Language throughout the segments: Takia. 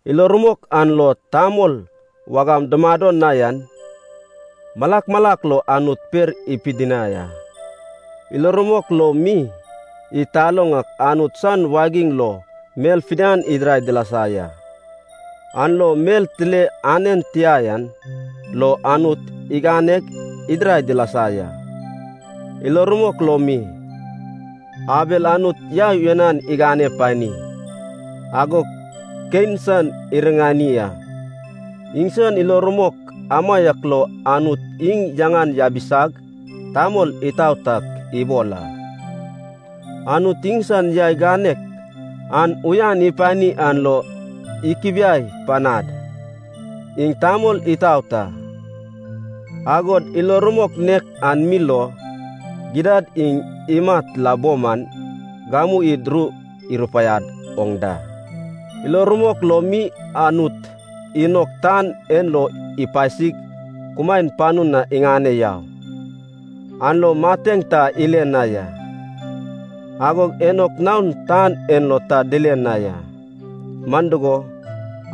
Ilo rumok an lo tamol wagam dumado na yan malak malak lo Anut per ipidinai a. Ilo rumok lo mi, id taloŋ ak Anut san wagiŋ lo mel fidian idirai dilasa ya, an lo mel tile anen tia yan lo Anut iganeg idirai dilasa ya. Ilo rumok lo mi, Abel Anut yai uyanan igane pani, agog Kein san iriŋani a. Iŋsan ilo rumok amaiak lo Anut iŋ yaŋan yabisag tamol itaot ak ibol a. Anut iŋsan yai ganek an uyan ipani an lo ikubiai panad, iŋ tamol itaot a. Agod ilo rumok nek an mi lo, gidad iŋ imat la bo man, gamu id ru irupaiad oŋ da. Ilo rumok lo mi, Anut Inok tan en lo ipasig kumaen panu na iŋane yau, an lo mateŋ ta ile na ya. Agog Enok naon tan en lo ta dile na ya, man dugo,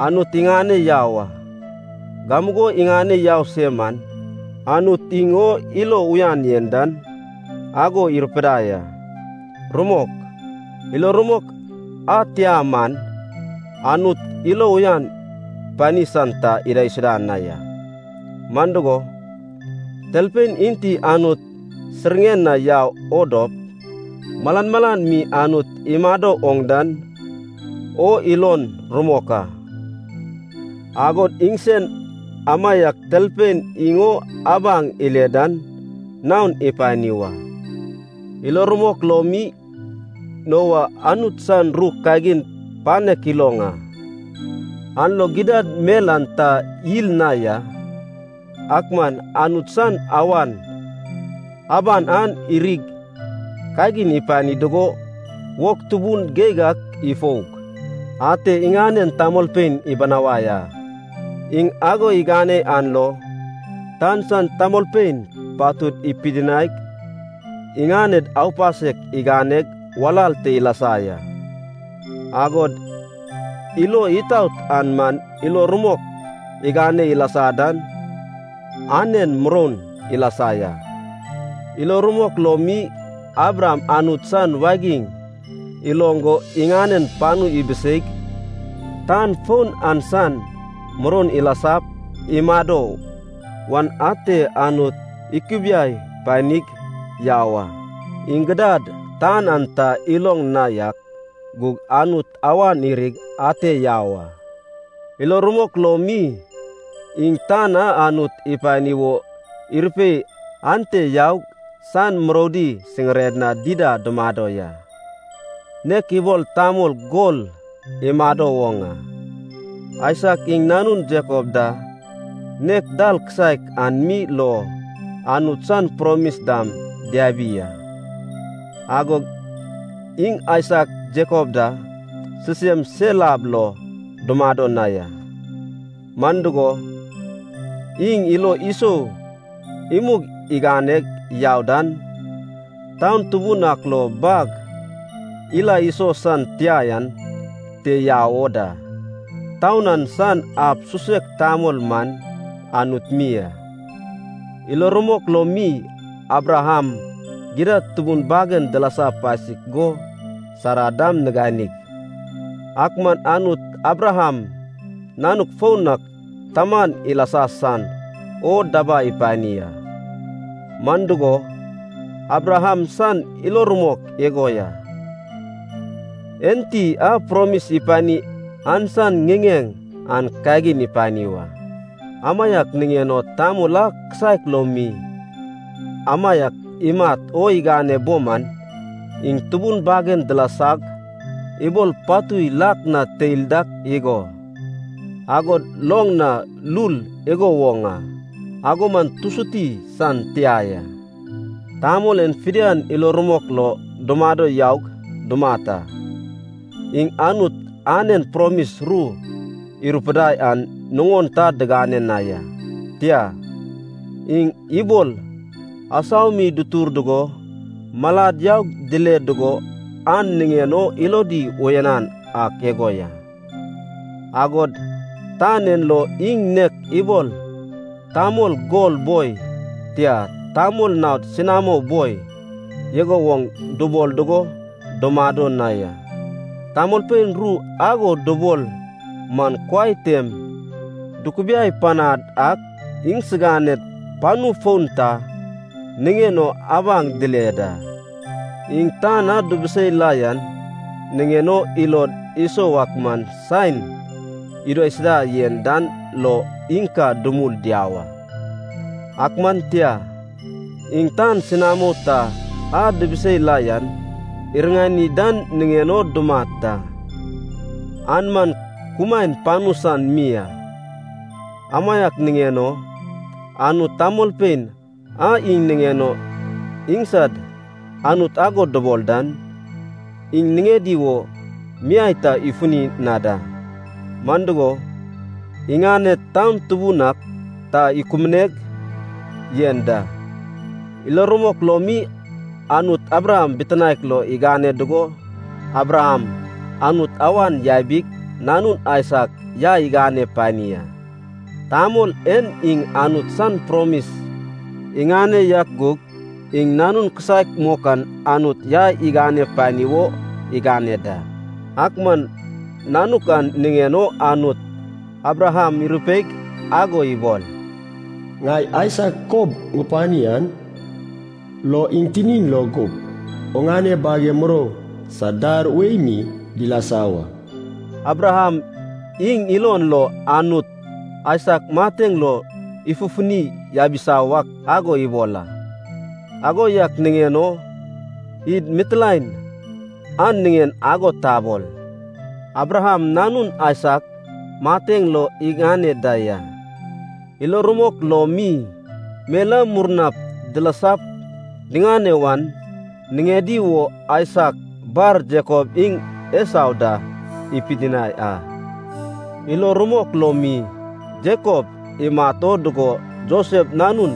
Anut iŋane yau a. Gamugo iŋane yau se man, Anut iŋ o ilo uyan yen dan ago irupidai a. Rumok, ilo rumok a tia man Anut ilo uyan pani san ta idaisuda na ya. Man dugo, talpein enti Anut siŋiren na yau o dop, malan malan mi Anut imado oŋ dan o ilon rumok a, agod iŋsen amaiak talpein iŋ o abaŋ ile dan naon ipani wa. Ilo rumok lo mi, Noa Anut san ru kagin panek iloŋ a, an lo gidad mel an ta yil na ya, ak man Anut san awan aban an irig kagin ipani dugo wog tubun geig ak ifoug, ate iŋanen tamolpein ibinawai a. Iŋ ago igane an lo tan san tamolpein patud ipidinaig iŋaned aupasek iganeg walal te ilasa ya, agod ilo itaot an man ilo rumok igane ilasa dan anen muroun ilasa ya. Ilo rumok lo mi, Abraham Anut san wagiŋ iloŋ go iŋanen panu ibiseig tan foun an san muroun ilasap imado wan ate Anut ikubiai panig yau a. Iŋ gidad tan an ta iloŋ na yak gug Anut awan irig ate yau a. Ilo rumok lo mi, iŋ tan a Anut ipani wo irupei ante yaug san muroudi siŋired na dida dumado ya, nek ibol tamol gol imado woŋ a. Aisak iŋ nanun Jakob da nek dal kisaek an mi lo Anut san promis dam diabi a. Agog iŋ Aisak Jakob da sisem sel ab lo dumado na ya. Man dugo, iŋ ilo isou imug iganeg yau dan, taun tubun ak lo bag ila iso san tia yan te yau o da. Taun an san ab susek tamol man Anut mi a. Ilo rumok lo mi, Abraham gidad tubun bagen dilasa pasik go Sara dam niganig, ak man Anut Abraham nanuk foun ak taman ilasa san o dabai ipani a. Man dugo, Abraham san ilo rumok igo ya, enti a promis ipani an san ŋiŋeŋ an kagin ipani wa. Amaiak niŋen o tamol a kisaek lo mi, amaiak imat o igane bo man, iŋ tubun bagen dilasag ibol patui lak na teil dak igo, agod loŋ na lul igo woŋ a. Ago man tusuti san tia ya. Tamol en fidian ilo rumok lo dumado yaug dumat a. Iŋ Anut anen promis ru irupidai an nuŋon ta diŋane na ya. Tia, iŋ ibol asau mi dutur dugo malad yaug dile dugo an niŋen o ilodi uyanan ak igo ya. Agod tan en lo iŋ nek ibol tamol gol boi, tia, tamol naod senamo boi, igo woŋ dubol dugo dumado na ya. Tamolpein ru ago dubol man kuai tem dukubiai panad ak iŋsiganed panu foun ta niŋen o abaŋ dile da. Iŋ tan a dubusei la yan niŋen o ilod isou ak man saen idaisuda yen dan lo iŋ ka dumul diau a. Ak man tia, iŋ tan senamo ta a dibisei la yan iriŋani dan niŋen o dumat da, an man kumaen panu san mi a. Amaiak niŋen o Anut tamolpein a iŋ niŋen o iŋsad Anut ago dubol dan, iŋ niŋedi wo miai ta ifuni na da. Man dugo, iŋaned taun tubun ak ta ikubuneg yen da. Ilo rumok lo mi, Anut Abraham bitinaek lo igane dugo Abraham Anut awan yabig, nanun Aisak yai igane pani a. Tamol en iŋ Anut san promis iŋane yak gug, iŋ nanun kisaek mok an Anut yai igane pani wo igane da. Ak man nanuk an niŋen o Anut Abraham irupeig ago ibol, “Ŋai Aisak kob ŋupani an lo iŋ tinin lo gup, oŋane bage murou sad dar wei mi dilasa wa.” Abraham iŋ ilon lo Anut Aisak mateŋ lo ifufuni yabisa wak ago ibol a. Ago yak niŋen o id mitilaen an niŋen ago tabol, Abraham nanun Aisak mateŋ lo iŋane da ya. Ilo rumok lo mi, mel a murna dilasap diŋane wan niŋedi wo Aisak bar Jakob iŋ Esau da ipidinai a. Ilo rumok lo mi, Jakob imat o dugo Josef nanun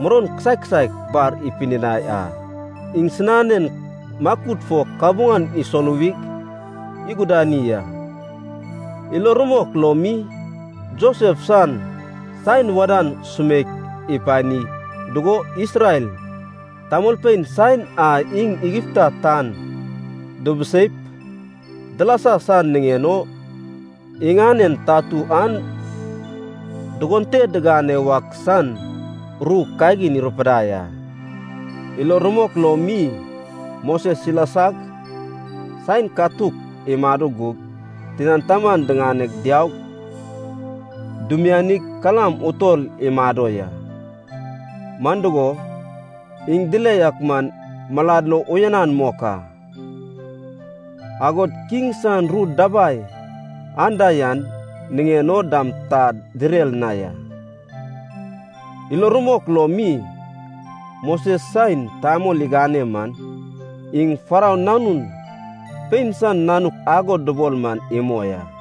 muroun kisaek kisaek bar ipidinai a. Iŋsinanen makud fo kabuŋan isoluwig igudani a. Ilo rumok lo mi, Josef san saen wadan sumeik ipani dugo Isrel tamolpein saen a iŋ Igipta tan dubuseip dilasa san niŋen o iŋanen tatu an dugon te digane wak san ru kagin irupidai a. Ilo rumok lo mi, Moses ilasag saen katuk imado gug tinan taman diŋane diaug dimianig kalam utol imado ya. Man dugo, iŋ dile yak man malad lo uyanan mok a, agod kiŋ san ru dabai anda yan niŋen o dam ta direr na ya. Ilo rumok lo mi, Moses saen tamol igane man iŋ Farou nanun pein san nanuk ago dubol man imoi a.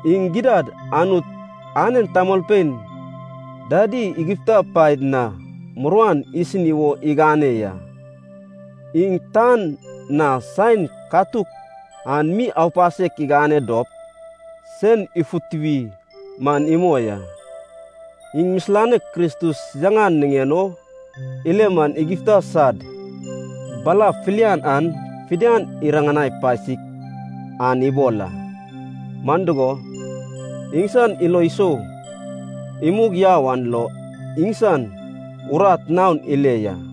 Iŋ gidad Anut anen tamolpein dadi Igipta paed na muruan isini wo igane ya. Iŋ tan na saen katuk an mi aupasek igane dop sen ifutuwi man imoi a. Iŋ misilanek Kristus yaŋan niŋen o ile man Igipta sad bala filian an fidian iriŋani pasik an ibol a. Man dugo, iŋsan ilo isou imug yau an lo iŋsan urat naon ile ya.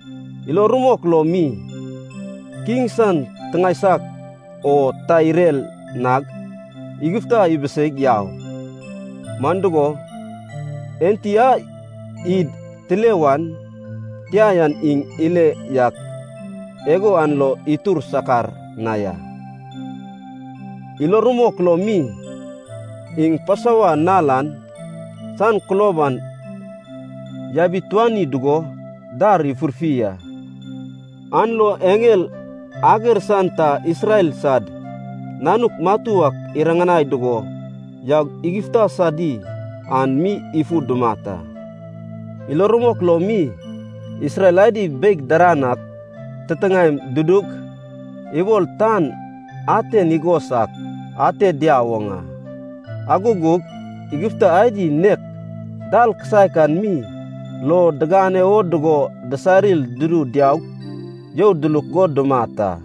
Ilo rumok lo mi, kiŋ san tiŋae saiak o ta irer nag Igipta ibiseig yau. Man dugo, enti a id tile wan tia yan iŋ ile yak igo an lo itur sakar na ya. Ilo rumok lo mi, iŋ Pasova nal an san kulob an yabituani dugo dar ifurfi a, an lo eŋel ager san ta Isrel sad nanuk matu ak iriŋanai dugo yaug Igipta sadi an mi ifu dumat a. Ilo rumok lo mi, Isrel adi beig daran ak titiŋaem dudug ibol tan aten igos ak ate diau woŋ a, ago gug Igipta adi nek dal kisaek an mi lo digane wo dugo disarir dudu diaug you duluk go dumat a.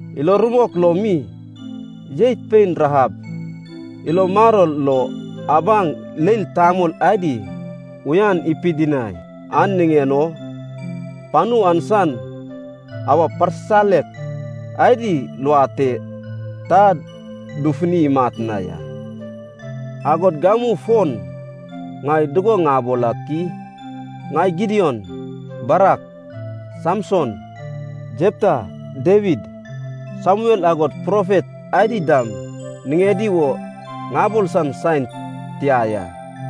Ilo rumok lo mi, jeit pein Rahab, ilo maror lo abaŋ leil tamol adi uyan ipidinai an niŋen o, panu an san awa parsisalek adi luad te ta dufuni imat na ya. Agod gamu fon ŋai dugo ŋabol ak i? Ŋai Gidion, Barak, Samson, Jepta, Dawid, Samuel agod profet adi dam niŋedi wo ŋabol san saen tia ya.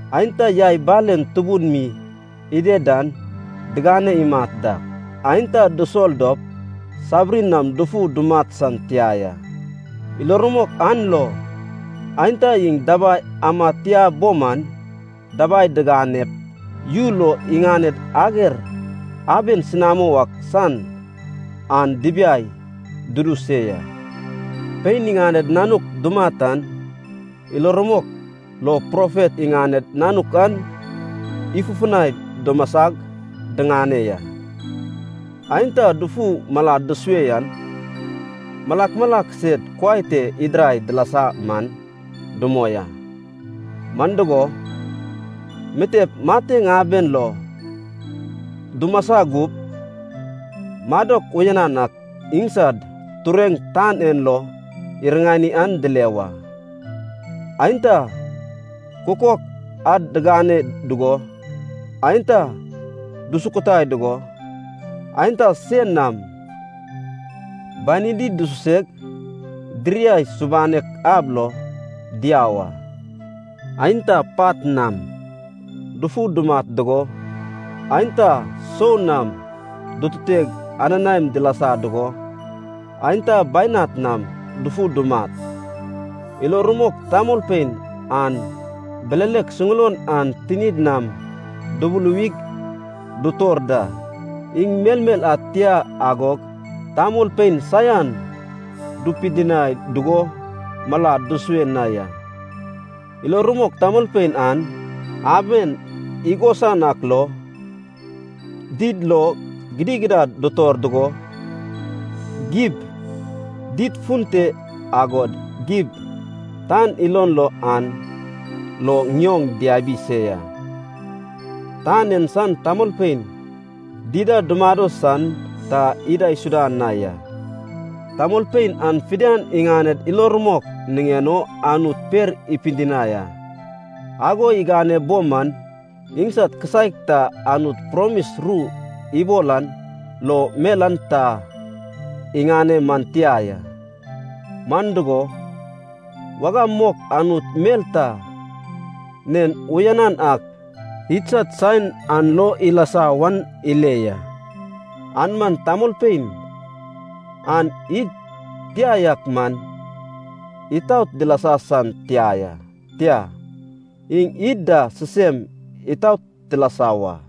Aenta yai balen tubun mi ided dan digane imat dak, aenta dusol dop sabiri nam dufu dumat san tia ya. Ilo rumok an lo, aenta iŋ dabai amad tia bo man dabai diŋanep, yu lo iŋaned ager aben senamo ak san an dibiai dudu se ya. Pein iŋaned nanuk dumat an ilo rumok lo profet iŋaned nanuk an ifufunai dimasag diŋane ya. Aenta dufu malad dusue yan malak malak sed kuai te idirai dilasa man dumoi a, man dugo, mitep mateŋ aben lo dumasa gup madok uyanan ak iŋsad tureŋ tan en lo iriŋani an dile wa. Aenta kukok ad digane dugo, aenta dusukutai dugo, aenta sein nam banidi dususeg diriai subanek ab lo diau a. Aenta pat nam dufu dumat dugo, aenta soa nam dututeg ananaem dilasa dugo, aenta bainat nam dufu dumat. Ilo rumok tamolpein an bilelek suŋulon an tinid nam dubuluwig dutor da, iŋ melmel ad tia agog tamolpein saian dupidinai dugo malad dusue na ya. Ilo rumok tamolpein an aben igosan ak lo, did lo gidigidad dutor dugo, gib did fun te agod gib tan ilon lo an lo ŋioŋ diabi se ya. Tan en san tamolpein dida dumado san ta idaisuda na ya. Tamolpein an fidian iŋaned ilo rumok niŋen o Anut per ipidinai a. Ago igane bo man iŋsad kisaek ta Anut promis ru ibol an lo mel an ta iŋane man tia ya. Man dugo, wagam mok Anut mel ta nen uyanan ak idsad saen an lo ilasa wan ile ya. An man tamolpein an id tia yak man itaot dilasa san tia ya, tia, iŋ id da sisem itaot tilasa wa.